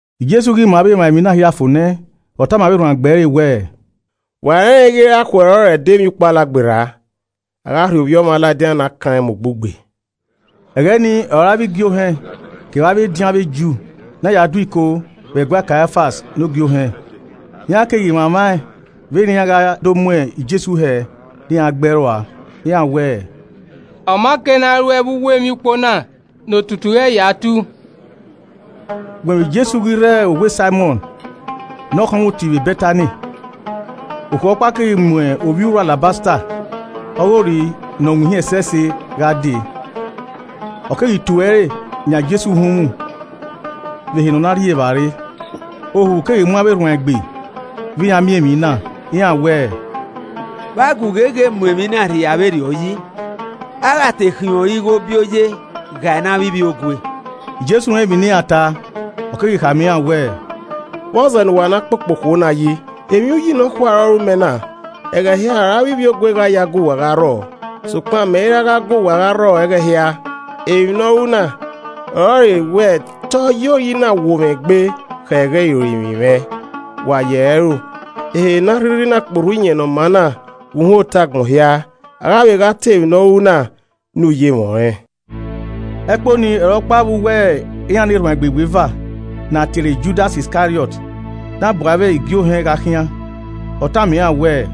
Jesu ghi ma avbe emwa emwi na hia fo nẹ, ọ tama avbe erhuanegbe ẹre wẹẹ, “Wa rẹnrẹn ighe irakhuẹ ọrọre ẹdẹ Emwiukpo Alagberra, a gha rhie Ovbi Ọmwa ladian ne akan rẹn mu ugbugbe.” Ẹghẹ ni ọre avbe igiohẹn kevbe avbe ediọn avbe Ju na ya do iko vbe ẹguae Kaiafas ne Ogie Ohẹn. Iran keghi mwamwa vbene iran gha ya do mu Jesu hẹ ne iran gbe ẹe rua. Iran wẹẹ, “Ọ ma kei ne a ruẹe vbe uwu emwiukpo na ne otutu ghẹ ya tu.” Ugbẹn vbe Jesu ghi rre owa Saimọn ne ọkhọnmwoti vbe Bẹtani, okhuo ọkpa keghi mu ovbi uru alabasta ọghe ori ne ọ winhin ẹsẹse gha dee, ọ keghi tue ẹre yan Jesu uhunmwu vbe ehe ne ọ na rri evbare. Ohu keghi mu avbe erhuanegbe vbe iran miẹn emwi na, iran wẹẹ, “Vbe a gu gheghe mu emwi na rhia vberriọ yi? A gha te khiẹn ori na ighobioye ghae ne avbe ivbiogue.” Jesu rẹn emwi ne iran ta, ọ keghi khama iran wẹẹ, “Vbọzẹ ne uwa na kpokpo okhuo na yi. Emwi uyi nọkhua ọre ọ ru mẹ na. Ẹghẹ hia ọre avbe ivbiogue gha ya gu wa gha rrọọ, sokpan mẹ i ra gha gu wa rrọọ ẹghẹ hia. Emwi ne ọ ru na ọrọre wẹ te ọ ye ori na wuo mwẹ egbe khẹ ẹghẹ irorinmwi mwẹ. Wa yi ẹre ẹro, ehe ne a rhirhi na kporhu iyẹn ne ọ maa na vbe uhunmwu otọe agbọn hia, a gha vbe gha ta emwi ne ọ ru na ya ye ẹre rre.” Ẹkpo nii ọre ọkpa vbe uwu iran ne erhuanegbe iweva, ne a tie ẹre Judas Iskariọt na bu avbe igie ohẹn gha khian. Ọ tama iran wẹẹ,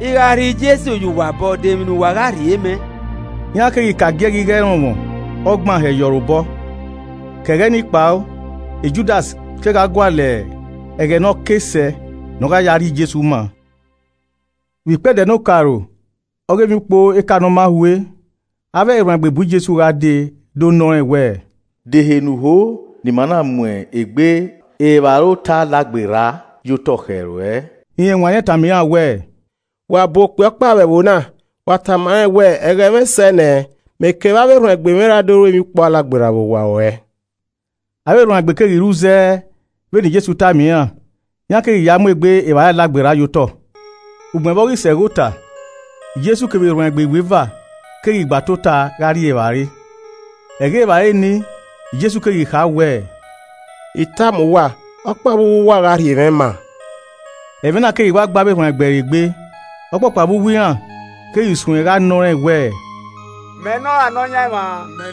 “I gha rhie Jesu ye uwa obọ, de emwi ne uwa gha rhie mẹ?” Iran keghi ka agiẹghẹ igho ẹrọnmwọ ọgban hẹ ye orre obọ. Ke ẹghẹ ni kpao Judas kegha gualọ ẹghẹ ne ọ ke sẹ ne ọ gha ya rhie Jesu maa. Vbe ikpẹdẹ ne okaro ọghe Emwiukpo Eka Ne ọ ma hue, avbe erhuanegbe bu Jesu gha dee do nọ rẹn wẹẹ, “De ehe ne u ho ne ima na mu egbe evbare ota Alagberra ye otọ khẹ ruẹ?” Rẹn wanniẹn tama iran wẹẹ, “Wa bu okpia ọkpa vbe ẹvbo na, wa tama rẹn wẹẹ, ‘Ẹghẹ mwẹ sẹ nẹ, mẹ kevbe avbe erhuanegbe mwẹ ra do ru Emwiukpo Alagberra vbe owa ruẹ.’” Avbe erhuanegbe keghi ru zẹ vbene Jesu tama iran, iran keghi ya mu egbe evbare Alagberra ye otọ. Ugbẹn vbe ọ ghi sẹ ẹghẹ ota, Jesu kevbe erhuanegbe iweva keghi gba tota gha rri evbare. Ẹghẹ evbare ni, Jesu keghi kha wẹẹ, “I tama uwa, ọkpa vbe uwu uwa gha rhie mwẹ maa.” Ẹmwẹ na keghi wa gbe avbe erhuanegbe ẹre egbe, ọkpọkpa vbe uwu iran keghi suẹn gha nọ rẹn wẹẹ, “Mẹ nọ ra Nọyaẹnmwa?”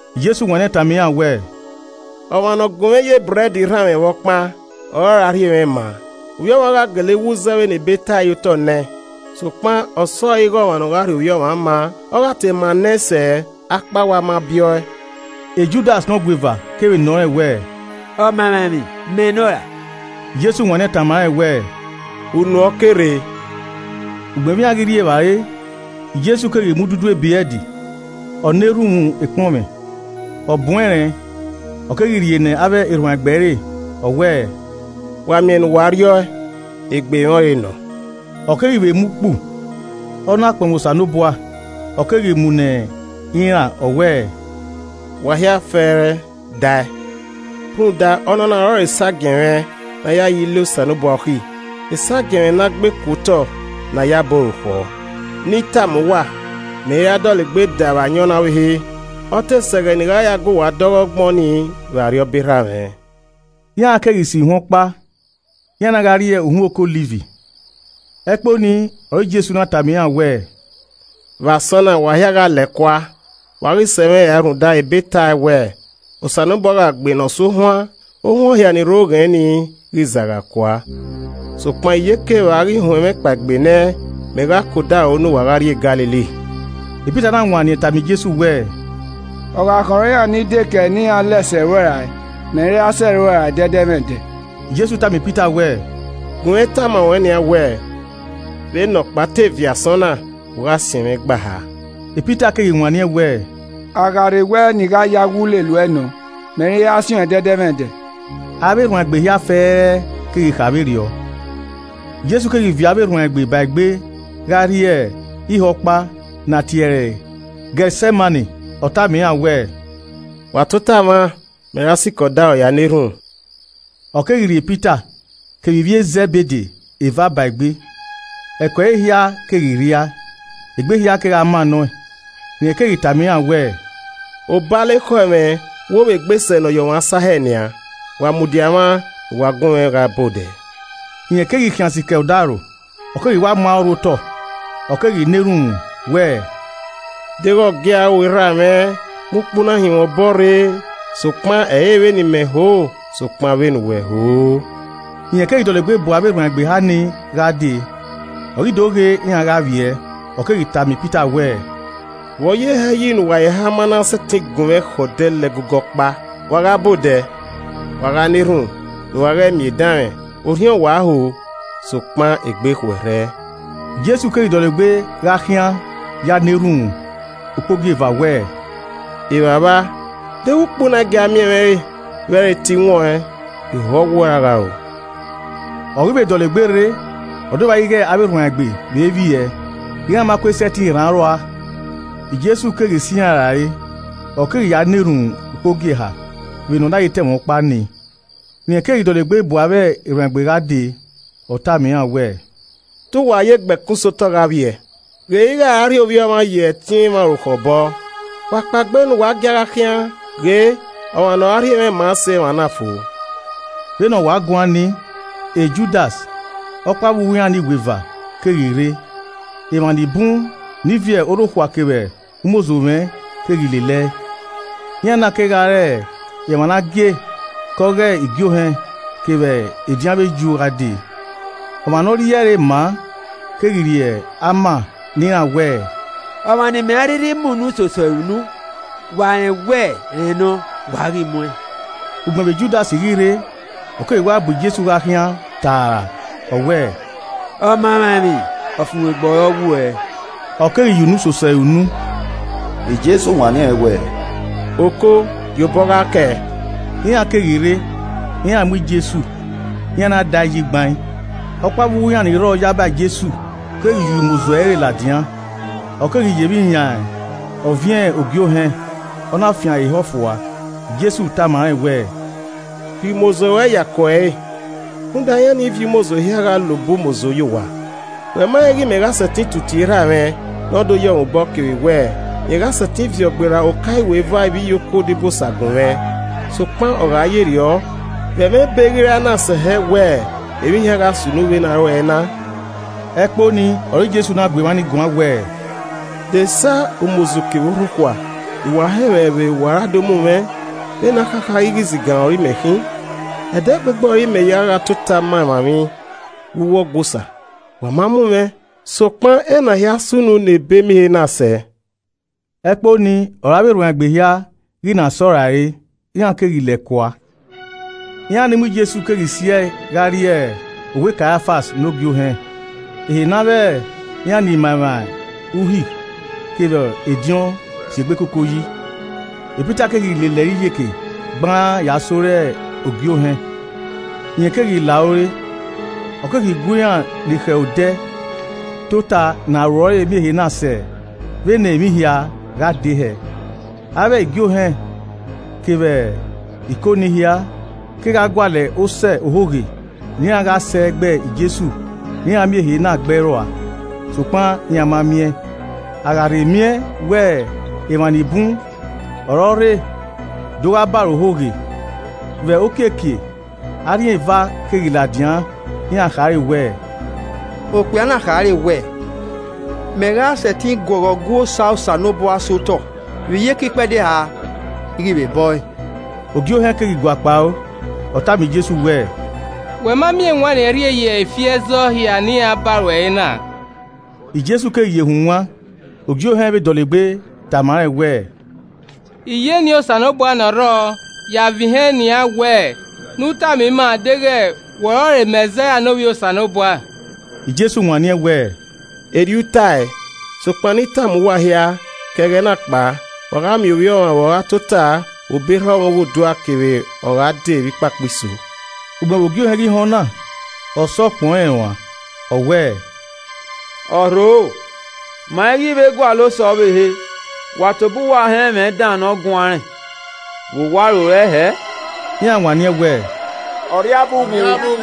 Jesu wanniẹn tama iran wẹẹ, “Ọmwa ne ọ gunmwẹ ye ebrẹd rhanmwẹ vbe ọkpan, ọre ọra rhie mwẹ maa. Ovbi Ọmwa gha gele wu zẹ vbene Ebe tae ye otọ nẹ, sokpan ọsọre ighe ọmwa ne ọ gha rhie Ovbi Ọmwa maa! Ọ gha te maa ne ẹn sẹ akpawẹ a ma biẹ ọe!” Judas ne ọgueva kevbe nọ rẹn wẹẹ, “Ọmamwaemwi, mẹ nọ ra?” Jesu wanniẹn tama rẹn wẹẹ, “Unu ẹn ọ ke rre.” Ugbẹn vbe iran ghi rri evbare, Jesu keghi mu ududu ebrẹd, ọ na erhunmwu ekpọnmwẹ, ọ bun ẹnrẹn, ọ keghi rhie ne avbe erhuanegbe ẹre, ọ wẹẹ, “Wa miẹn ne uwa rri ọ e, egbe mwẹ ọ re nọ.” Ọ keghi vbe mu ukpu, Ọ na kpọnmwẹ Osanobua, ọ keghi mu ne iran, ọ wẹẹ, “Wa hia fẹẹrẹ, dae. Rhunmwuda, ọnọna ọrọre esagiẹn mwẹ ne a ya ya Ile Osanobua okhi, esagiẹn mwẹ ne a gbe ku otọ ne ayabọ orukhọ. Ne I tama uwa, mẹ i ra dọlegbe da vbe ayọn na ọvbehe, ọ te sẹ ẹghẹ ne I gha ya guwa da ọghe ọgbọn ni vbe Arriọba Erha mwẹ.” Iran keghi so ihuan ọkpa, iran na gha rrie uhunmwu Oke Ọliv. Ẹkpo ni ọre Jesu na tama iran wẹẹ, “Vbe asọn na, wa hia gha lẹ kua, wa ghi sẹ mwẹ rae rhunmwuda ebe tae wẹẹ, ‘Osanobua gha gbe ne ọ su ohuan, ohuan hia ni rre oghẹn ni, ghi zagha kua.’ Sokpan iyeke vbe a ghi huẹn mwẹ kpaegbe nẹ mẹ gha ke odaro ne uwa gha rrie Galili.” Pita na wanniẹn tama Jesu wẹẹ, “Ọ gha khọn iran ni dekẹe ne iran lẹ sẹ uẹ rae mẹ i ra sẹ uẹ rae ẹdẹdẹmwẹdẹ.” Jesu tama Pita wẹẹ, “Gunmwẹ tama ruẹn nian wẹẹ, vbene ọkpa te viẹ asọn na, u gha siẹn mwẹ igba eha.” Pita keghi wanniẹn wẹẹ, “A gha rhe wẹ ne I gha ya wu lele uẹ nọ, mẹ i ra siẹn uẹn ẹdẹdẹmwẹdẹ.” Avbe erhuanegbe hia fẹẹrẹ keghi vbe kha vberriọ. Jesu keghi viọ avbe erhuanegbe ẹre ba egbe gha rrie ihe ọkpa ne a tie ẹre Getsemani. Ọ tama iran wẹẹ, “Wa tota mwa, mẹ ra sikẹ odọ ya na erhunmwu.” Ọ keghi rhie Pita kevbe ivbi e Zẹbede eva ba egbe. Ẹko ẹre hia keghi rhie, egbe hia kegha mannọ ẹn. Rẹn keghi tama iran wẹẹ, “Obalọ ekhọe mwẹ wo vbe egbe sẹ ne ọ ye ọmwa sa hẹ nian, wa mudia mwa ne uwa gunmwẹ gha ba odẹ.” Rẹn keghi khian sikẹ odaro, ọ keghi wa mu aro rhu otọ ọ keghi na erhunmwu wẹẹ, “Deghẹ ọ gia ru, Erha mwẹ, mu ukpu na hin mwẹ obọ rre, sokpan ẹ i re vbene I mẹ ho, sokpan vbene uwẹ ho.” Rẹn keghi dọlegbe bu avbe erhuanegbe eha ni gha dee, ọ ghi do ghe iran gha vbiẹ, ọ keghi tama e Pita wẹẹ, “Vbọ ye hẹ yi ne uwa eheha ma na sẹtin gunmwẹ khẹ odẹ la ẹgogo ọkpa? Wa gha ba odẹ, wa gha na erhunmwu ne uwa ghẹ miẹn edanmwẹ, orhiọn wa ho sokpan egbe khuẹrhẹ.” Jesu keghi dọlegbe gha khian ya na erhunmwu ukpogieva wẹẹ, “Evbavba, deghẹ ukpu na i gia miẹn mwẹ re vbe ẹ i re te I wọn ẹn, iho ọwuẹ ọre a gha ru.” Ọ ghi vbe dọlegbe rre, ọ do vba ighẹ avbe erhuanegbe vbe vbiẹ, iran ma kue sẹtin rhan aro rua. Jesu keghi sẹ iran rae, ọ keghi ya na erhunmwu ukpogieha, vbene ọ na ye ta ẹmwẹ ọkpa nii. Rẹn keghi dọlegbe bu avbe erhuanegbe gha dee, ọ tama iran wẹẹ, “Te uwa ye gbe ẹkun sẹ otọ gha vbiẹ? Ghe ighẹ a ra rhie Ovbi Ọmwa ye ẹtin emwa orukhọ obọ. Wa kpaegbe ne uwa gia gha khian, ghe, ọmwa ne ọ ra rhie mwẹ maa sẹ emwa na fo.” Vbene ọ wa guan nii, Judas, ọkpa vbe uwu iran ne iweva keghi rre. Emwa ni bun ni viọ orhokhua kevbe umozo mwẹ keghi lele ẹe, iran na kegha re emwa ne a gie ke ọ ghe igie ohẹn kevbe ediọn avbe Ju gha dee. Ọmwa ne ọ rhie ẹre maa keghi rhie ama ne iran wẹẹ, “Ọmwa ne imẹ a rhirhi mu unu soso ẹre unu, wa rẹn wẹ rẹn nọ. Wa ghi mu ẹn.” Ugbẹn vbe Judas ghi rre, ọ keghi wa bu Jesu gha khian taara, ọ wẹẹ, “Ọmaemwaemwi, ọfumwegbe ọ re ọwuẹ,” ọ keghi ya unu soso ẹre unu. Jesu wanniẹn wẹẹ, “Oko, gie obọ gha kẹe.” Iran keghi rre, iran mu Jesu, iran na da ẹe yi gbain. Ọkpa vbe uwu iran ni rrọọ yaba Jesu keghi yuo umozo ẹre ladian, ọ keghi ye emwi yan ọviẹn ogie ohẹn, ọ na fian ẹre ehọ fua. Jesu tama rẹn wẹẹ, “Rhie umozo ruẹ ye ako ẹre, rhunmwuda iran ni viọ umozo hia gha la obọ umozo yo owa. Wẹ ma rẹn ighẹ mẹ gha sẹtin tu tie Erha mwẹ ne ọ yọ mwẹ obọ kevbe wẹẹ, rẹn gha sẹtin viọ gberra oka iweva ivbiyokuo odibosa gun mwẹ? Sokpan ọ gha ye rriọ, vbe ẹmwẹ Ebe ghi ra na sẹ hẹ wẹẹ emwi hia gha sunu vbe ne a ru ẹe na?” Ẹkpo ni ọre Jesu na gu emwa ni guan wẹẹ, “De esa umozo kevbe orhokhua ne uwa hẹ mwẹ vbe uwa ra do mu mwẹ, vbene akhakha ighẹ izigan ọre imẹ khin? Ẹdẹgbegbe ọre imẹ ya gha tota ma emwa emwi vbe uwu Ọgua Osa, wa ma mu mwẹ. Sokpan ena hia sunu ne Ebemiẹn ehe na sẹ.” Ẹkpo ni ọre avbe erhuanegbe hia ghi na sẹ ọe rae, iran keghi lẹ kua. Iran ni mu Jesu keghi si ẹe gha rrie owa Kaiafas ne Ogie Ohẹn, ehe ne avbe iran ni ma emwa Uhi kevbe ediọn si egbe koko yi. Pita keghi lele ẹre iyeke gbaan ya sẹ ore Ogie Ohẹn. Rẹn keghi la ore, ọ keghi gu iran ni khẹ odẹ tota ne aro ẹre miẹn ehe na sẹ vbene emwi hia gha dee hẹẹ. Avbe igie ohẹn kevbe Iko nii hia, kegha gualọ osẹe ohoghe ne iran gha sẹ gbe Jesu ne iran miẹn ehe na gbe ẹe rua. Sokpan iran ma miẹn, a gha rhe miẹn wẹ emwa ni bun ọre ọ rre do gha ba ẹre ohoghe. Vbe okiekie, arhin eva keghi ladian iran khare wẹẹ, “Okpia na khare wẹẹ, ‘Mẹ gha sẹtin guọghọ Ọgua Osa Osanobua sẹ otọ, vbe iyeke ikpẹdẹ eha, I ghi vbe bọ ẹe.’” Ogie Ohẹn keghi guakpao, ọ tama Jesu wẹẹ, “Wẹ ma miẹn ewanniẹn rhie ye ifi ẹzọ hia ne iran ba ruẹ re na?” Jesu keghi ye hunwan. Ogie Ohẹn vbe dọlegbe tama rẹn wẹẹ, “I ya eni Osanobua ne ọ rrọọ ya a vẹn ihẹn nian wẹ ne u tama ima deghẹ wẹ ọrọre Mẹzaia ne Ovbi Osanobua.” Jesu wanniẹn wẹẹ, “Erriọ u tae, sokpan ne I tama uwa hia, ke ẹghẹ na kpao, wa gha miẹn Ovbi Ọmwa vbe ọ gha tota vbe obọ erha ọmwa Oghodua kevbe ọ gha dee vbe ikpakpa iso.” Ugbẹn vbe Ogie Ohẹn ghi họn ọna, ọ sọ ukpọn rẹn uan. Ọ wẹẹ, “Ọ rhoro, ma i ghi vbe gualọ osẹe ọvbehe. Wa tobọ uwa họn ẹmwẹ dan ne ọ guan rẹn. Vbe uwa rorẹe hẹẹ?” Iran wanniẹn wẹ, “Ọ rria abe uwu.”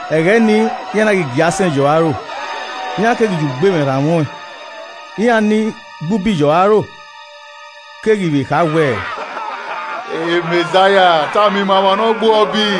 Ẹghẹ ni, iran na ghi gie asẹn ye ọre aro, iran keghi ya ugbemwẹ rhanmwẹ ọẹn. Iran ni gbe ubi ye ọre aro keghi vbe kha wẹẹ, “Mẹzaia, tama ima ọmwa ne ọ gbe uẹ ubi?”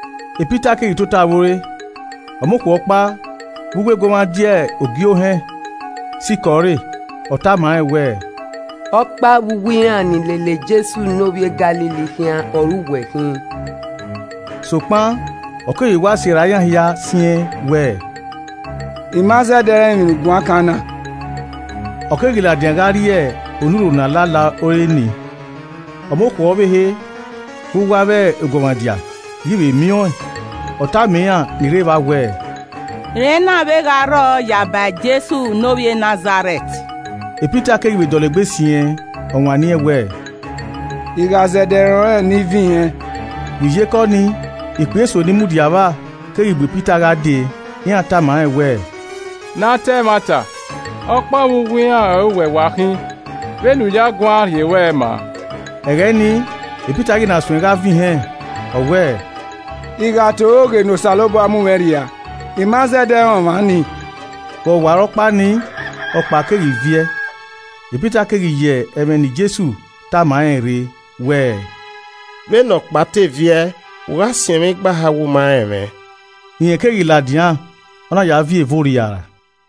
Pita keghi tota vbe ore, ọmọ okhuo ọkpa vbe uwu eguọmwadia Ogie Ohẹn sikẹ ọre, ọ tama rẹn wẹẹ, “Ọkpa vbe uwu iran ni lele Jesu ne ovbi e Galili khian ọre uwẹ khin.” Sokpan, ọ keghi wa sirra iran hia siẹn wẹ, “I ma zẹdẹ rẹn emwi ne u guan kan na.” Ọ keghi ladian gha rrie onurho ne a la la ore ni, Ọmọ okhuo ọvbehe, vbe uwu avbe eguọmwadia ghi vbe miẹn ọẹn, ọ tama iran ni rre evba wẹẹ, “Rẹn na vbe gha rrọọ yaba Jesu ne ovbi e Nazarẹt.” Pita keghi vbe dọlegbe siẹn ọ wanniẹn wẹẹ, “I gha zẹdẹ rẹn ọnrẹn ne I vẹn ihẹn.” Vbe iyeke ọnii, ikpia eso ni mudia vba keghi bu e Pita gha dee, iran tama rẹn wẹẹ, “Ne a ta ẹmwata, ọkpa vbe uwu iran ọre uwẹ wa khin, vbene u ya guan rhie ruẹ maa.” Ẹghẹ ni, Pita ghi na suẹn gha vẹn ihẹn, ọ wẹẹ, “I gha ta ohoghe, ne Osanobua mu mwẹ rhia, I ma zẹdẹ rẹn ọmwa nii!” Vbe ọwarọkpa nii, ọkpa keghi viẹ. Pita keghi ye ẹmwẹ ne Jesu tama rẹn rre wẹẹ, “Vbene ọkpa te viẹ, u gha siẹn igba eha wẹ u ma rẹn mwẹ.” Rẹn keghi ladian, ọ na ya viẹ eve orriara.